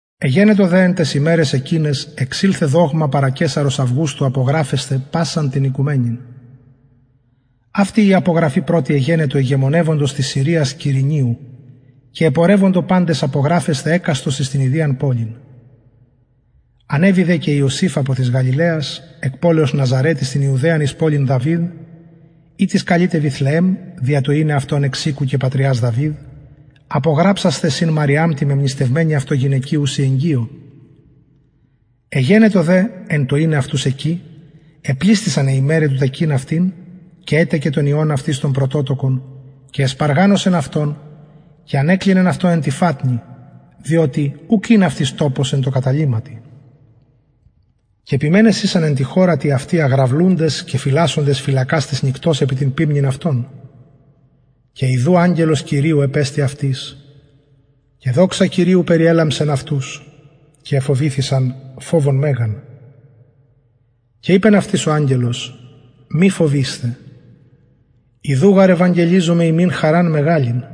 εγενετο δε εν ταις ημεραις εκειναις εξηλθεν δογμα παρα καισαρος αυγουστου απογραφεσθαι πασαν την οικουμενην αυτη η απογραφη πρωτη εγενετο ηγεμονευοντος της συριας κυρηνιου και επορευοντο παντες απογραφεσθαι εκαστος εις την ιδιαν πολιν ανεβη δε και ιωσηφ απο της γαλιλαιας εκ πολεως ναζαρετ εις την ιουδαιαν εις πολιν δαυιδ ητις καλειται βηθλεεμ δια το ειναι αυτον εξ οικου και πατριας δαυιδ απογραψασθαι συν μαριαμ τη μεμνηστευμενη αυτω γυναικι ουση εγκυω εγενετο δε εν τω ειναι αυτους εκει επλησθησαν αι ημεραι του τεκειν αυτην και ετεκεν τον υιον αυτης τον πρωτοτοκον και εσπαργανωσεν αυτον και ανεκλινεν αυτον εν τη φατνη διοτι ουκ ην αυτοις τοπος εν τω καταλυματι και ποιμενες ησαν εν τη χωρα τη αυτη αγραυλουντες και φυλασσοντες φυλακας της νυκτος επι την ποιμνην αυτων και ιδου αγγελος κυριου επεστη αυτοις και δοξα κυριου περιελαμψεν αυτους και εφοβηθησαν φοβον μεγαν και ειπεν αυτοις ο αγγελος μη φοβεισθε ιδου γαρ ευαγγελιζομαι υμιν χαραν μεγαλην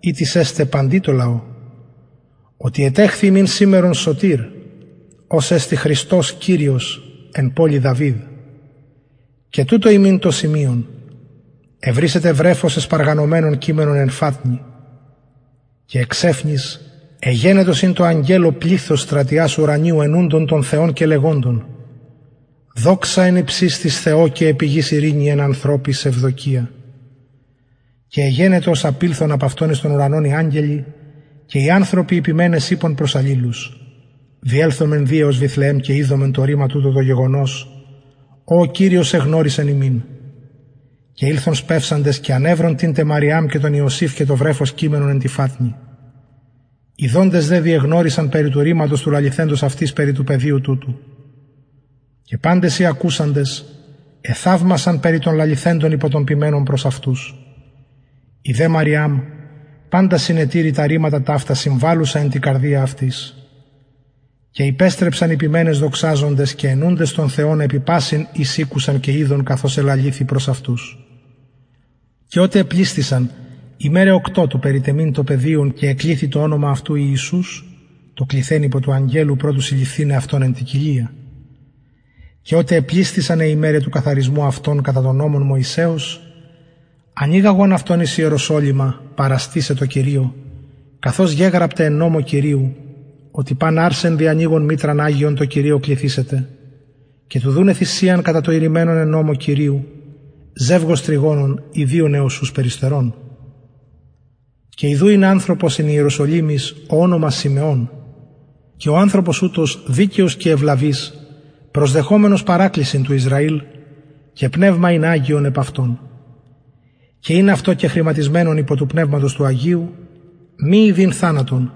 ητις εσται παντι τω λαω οτι ετεχθη υμιν σημερον σωτηρ ος εστιν χριστος κυριος εν πολει δαυιδ και τουτο υμιν το σημειον ευρησετε βρεφος εσπαργανωμενον κειμενον εν φατνη και εξαιφνης εγενετο συν τω αγγελω πληθος στρατιας ουρανιου αινουντων τον θεον και λεγοντων δοξα εν υψιστοις θεω και επι γης ειρηνη εν ανθρωποις ευδοκια και εγενετο ως απηλθον απ αυτων εις τον ουρανον οι αγγελοι και οι ανθρωποι οι ποιμενες ειπον προς αλληλους διελθωμεν δη εως βηθλεεμ και ιδωμεν το ρημα τουτο το γεγονος ο ο κυριος εγνωρισεν ημιν και ηλθον σπευσαντες και ανευρον την τε μαριαμ και τον ιωσηφ και το βρεφος κειμενον εν τη φατνη ιδοντες δε διεγνωρισαν περι του ρηματος του λαληθεντος αυτοις περι του παιδιου τουτου και παντες οι ακουσαντες εθαυμασαν περι των λαληθεντων υπο των ποιμενων προς αυτους η δε μαριαμ παντα συνετηρει τα ρηματα ταυτα συμβαλλουσα εν τη καρδια αυτης και υπεστρεψαν οι ποιμενες δοξαζοντες και αινουντες τον θεον επι πασιν οις ηκουσαν και ειδον καθως ελαληθη προς αυτους και οτε επλησθησαν ημεραι οκτω του περιτεμειν αυτον και εκληθη το ονομα αυτου ιησους το κληθεν υπο του αγγελου προ του συλληφθηναι αυτον εν τη κοιλια και οτε επλησθησαν αι ημεραι του καθαρισμου αυτων κατα τον νομον μωσεως ανηγαγον αυτον εις ιεροσολυμα παραστησαι τω κυριω καθως γεγραπται εν νομω κυριου οτι παν αρσεν διανοιγον μητραν αγιον τω κυριω κληθησεται και του δουναι θυσιαν κατα το ειρημενον εν νομω κυριου ζευγος τρυγονων η δυο νεοσσους περιστερων και ιδου ην ανθρωπος εν ιερουσαλημ ω ονομα συμεων και ο ανθρωπος ουτος δικαιος και ευλαβης προσδεχομενος παρακλησιν του ισραηλ και πνευμα ην αγιον επ αυτον και ην αυτω κεχρηματισμενον υπο του πνευματος του αγιου μη ιδειν θανατον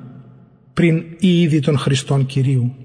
πριν η ιδη τον χριστον κυριου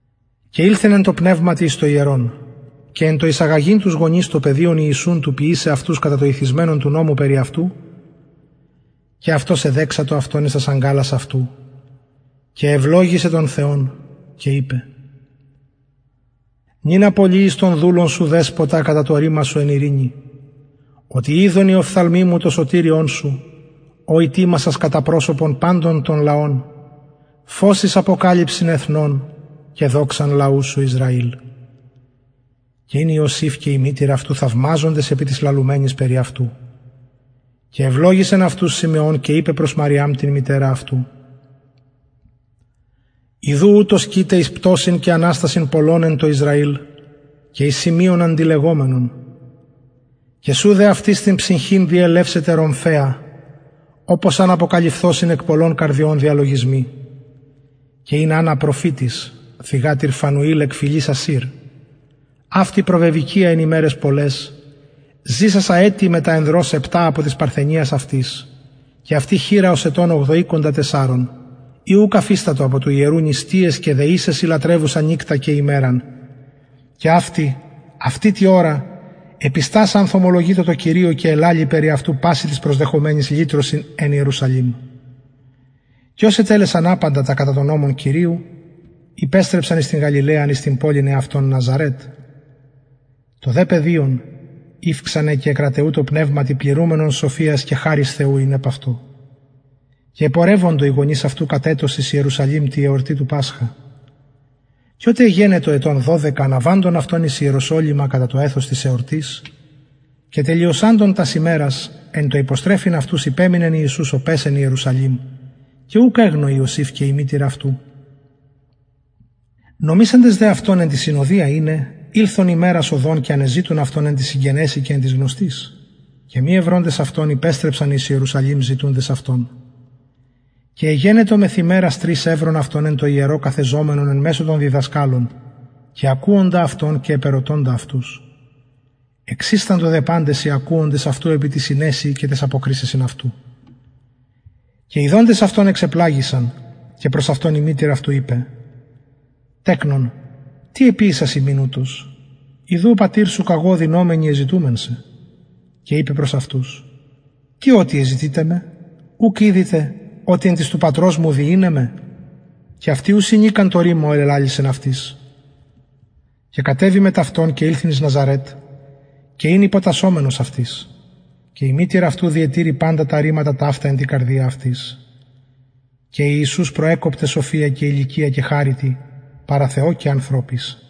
και ηλθεν εν τω πνευματι εις το ιερον και εν τω εισαγαγειν τους γονεις το παιδιον ιησουν του ποιησαι αυτους κατα το ειθισμενον του νομου περι αυτου και αυτος εδεξατο αυτο εις τας αγκαλας αυτου και ευλογησεν τον θεον και ειπεν νυν απολυεις τον δουλον σου δεσποτα κατα το ρημα σου εν ειρηνη οτι ειδον οι οφθαλμοι μου το σωτηριον σου ο ητοιμασας κατα προσωπον παντων των λαων φως εις αποκαλυψιν εθνων και δοξαν λαου σου ισραηλ και ην ιωσηφ και η μητηρ αυτου θαυμαζοντες επι τοις λαλουμενοις περι αυτου και ευλογησεν αυτους συμεων και ειπεν προς μαριαμ την μητερα αυτου ιδου ουτος κειται εις πτωσιν και αναστασιν πολλων εν τω ισραηλ και εις σημειον αντιλεγομενον και σου δε αυτης την ψυχην διελευσεται ρομφαια οπως αν αποκαλυφθωσιν εκ πολλων καρδιων διαλογισμοι και ην αννα προφητις θυγατηρ φανουηλ εκ φυλης ασηρ αυτη προβεβηκυια εν ημεραις πολλαις ζησασα ετη μετα ανδρος επτα απο της παρθενιας αυτης και αυτη χηρα ως ετων ογδοηκοντα τεσσαρων η ουκ αφιστατο απο του ιερου νηστειαις και δεησεσιν λατρευουσα νυκτα και ημεραν και αυτη αυτη τη ωρα επιστασα ανθωμολογειτο τω κυριω και ελαλει περι αυτου πασιν τοις προσδεχομενοις λυτρωσιν εν ιερουσαλημ και ως ετελεσαν απαντα τα κατα τον νομον κυριου υπεστρεψαν εις την γαλιλαιαν εις την πολιν εαυτων ναζαρετ το δε παιδιον ηυξανεν και εκραταιουτο πνευματι πληρουμενον σοφιας και χαρις θεου ην επ αυτο και επορευοντο οι γονεις αυτου κατ ετος εις ιερουσαλημ τη εορτη του πασχα και οτε εγενετο ετων δωδεκα αναβαντων αυτων εις ιεροσολυμα κατα το εθος της εορτης και τελειωσαντων τας ημερας εν τω υποστρεφειν αυτους υπεμεινεν ιησους ο παις εν ιερουσαλημ και ουκ εγνω ιωσηφ και η μητηρ αυτου νομισαντες δε αυτον εν τη συνοδια ειναι ηλθον ημερας οδον και ανεζητουν αυτον εν τοις συγγενεσιν και εν τοις γνωστοις και μη ευροντες αυτον υπεστρεψαν εις ιερουσαλημ ζητουντες αυτον και εγενετο μεθ ημερας τρεις ευρον αυτον εν τω ιερω καθεζομενον εν μεσω των διδασκαλων και ακουοντα αυτων και επερωτωντα αυτους εξισταντο δε παντες οι ακουοντες αυτου επι τη συνεσει και ταις αποκρισεσιν αυτου και ιδοντες αυτον εξεπλαγησαν και προς αυτον η μητηρ αυτου ειπεν τεκνον τι εποιησας ημιν ουτως ιδου ο πατηρ σου καγω οδυνωμενοι εζητουμεν σε και ειπεν προς αυτους τι οτι εζητειτε με ουκ ηδειτε οτι εν τοις του πατρος μου δει ειναι με και αυτοι ου συνηκαν το ρημα ο ελαλησεν αυτοις και κατεβη μετ αυτων και ηλθεν εις ναζαρετ και ην υποτασσομενος αυτοις και η μητηρ αυτου διετηρει παντα τα ρηματα ταυτα εν τη καρδια αυτης και ιησους προεκοπτεν σοφια και ηλικια και χαριτι παρα θεω και ανθρωποις